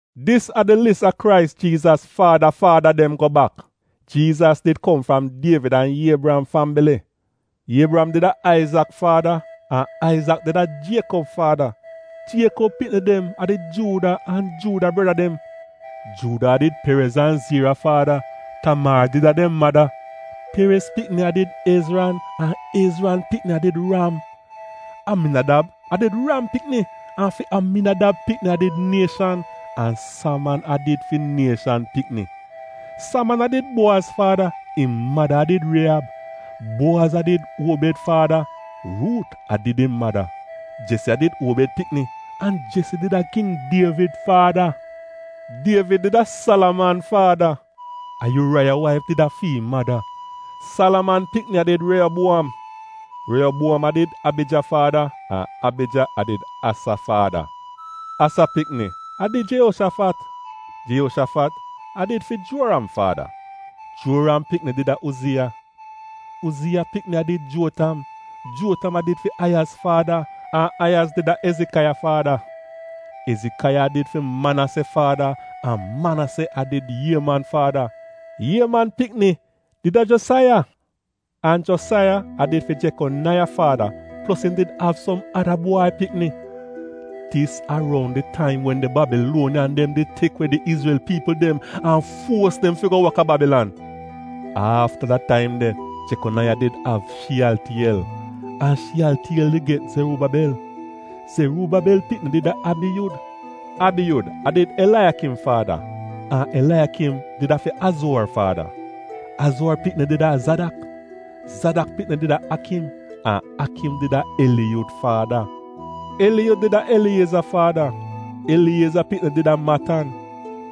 Dis a di lis a Krais Jiizas faada faada dem go bak. Jiizas did kom fram Dievid an Iebriyam fambili. Iebriyam did a Aizak faada, an Aizak did a Jiekob faada, Jiekob pikni dem a did Juuda an Juuda breda dem. Juuda a did Perez an Ziira faada (Tamaar did a dem mada), Perez pikni a did Ezran an Ezran pikni a did Ram. Aminadab a did Ram pikni, an fi Aminadab pikni a did Nieshan, an Saman a did fi Nieshan pikni. Saman a did Buowaz faada (im mada a did Rieyab), Buowaz a did Uobed faada (Ruut a did im mada). Jesi a did Uobed pikni, an Jesi did a king Dievid faada. Dievid did a Salaman faada (a Yuuraiya waif did a fi im mada), Salaman pikni a did Reyobuom, Reyobuom a did Abija faada, an Abija a did Asa faada. Asa pikni a did Jeyoshafat, Jeyoshafat a did fi Juoram faada, Juoram pikni did a Uziya. Uziya pikni a did Juotam, Juotam a did fi Ayaz faada, an Ayaz did a Ezikaiya faada. Ezikaiya a did fi Manase faada an Manase a did Ieman faada. Ieman pikni did a Josaiya, an Josaiya a did fi Jekonaiya faada plos im did av som ada bwai pikni. Dis a roun di taim wen di Babiluoniyan dem did tek we di Izrel piipl dem an fuos dem fi go wok a Babilan. Afta da taim de: Jekonaiya did av Shiyaltiyel, an Shiyaltiyel did get Zeruubabel. Zeruubabel pikni did a Abiyud, Abiyud a did Elaiyakim faada, an Elaiyakim did a fi Azuor faada. Azuor pikni did a Zadak, Zadak pikni did a Akim, an Akim did a Eliyud faada. Eliyud did a Elieza faada, Elieza pikni did a Matan,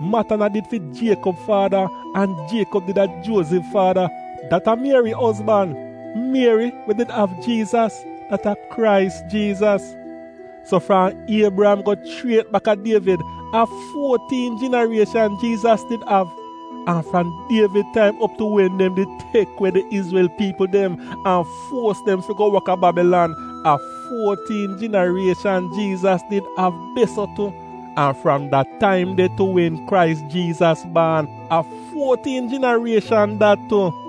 Matan a did fi Jiekob faada, an Jiekob did a Juozif faada, dat a Mieri ozban — Mieri we did av Jiizas — dat a Krais Jiizas. So fram Iebriyam go chriet bak a Dievid, a fuotiin jinarieshan Jiizas did av. An fram Dievid taim op tu wen dem did tek we di Izrel piipl dem an fuos dem fi go wok a Babilan a fuotiin jinarieshan Jiizas did av de-so tu, an fram da taim de tu wen Krais Jiizas baan, a fuotiin jinarieshan dat tu.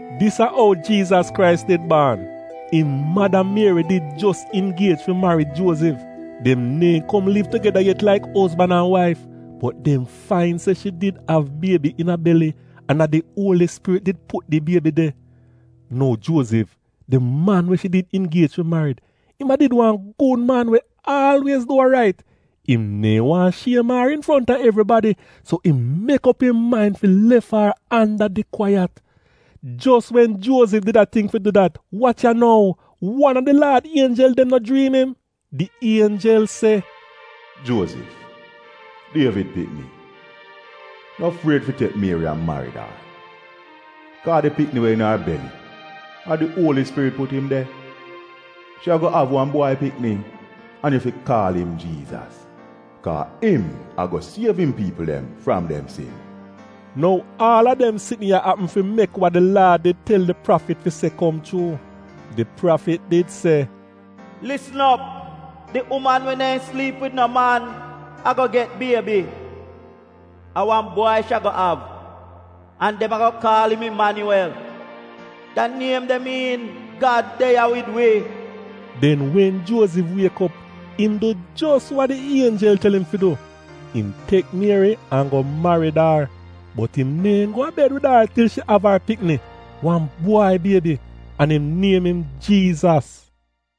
Dis a ou Jiizas Krais did baan. Im mada Mieri did jos ingiej fi marid Juozif, dem neehn kom liv tugeda yet laik ozban an waif, bot dem fain se shi did av biebi iina beli, an a di Uoli Spirit did put da biebi de. Nou Juozif, di man we shi did ingiej fi marid, im a did wan gud man we aalwiez du wa rait. Im neehn waahn shiem ar infronta evribadi, so im mek op im main fi lef ar anda di kwaiyat. Jos wen Juozif did a tingk fi du dat, wach ya nou — wan a di Laad ienjel dem no jriim im. Di ienjel se, “Juozif, Dievid pikni no fried fi tek Mieri an marid ar, kaa di pikni we iina ar beli, a di Uoli Spirit put im de. Shi ago av wan bwai pikni an yu fi kaal im Jiizas, kaa im ago siev im piipl dem fram dem sin.” Nou aal a dem sitn ya apm fi mek wa di Laad did tel di prafit fi se kom chuu. Di prafit did se, “Lisn op! Di uman we neehn sliip wid no man ago get biebi — a wan bwai shi ago av, an dem ago kaal im Imanyuwel.” Da niem de miin, “Gad de ya wid wi.” Den wen Juozif wiek op, im du jos wa di ienjel tel im fi du. Im tek Mieri an go marid ar. Bot im neehn go a bed wid ar til shi av ar pikni — wan bwai biebi; an im niem im Jiizas.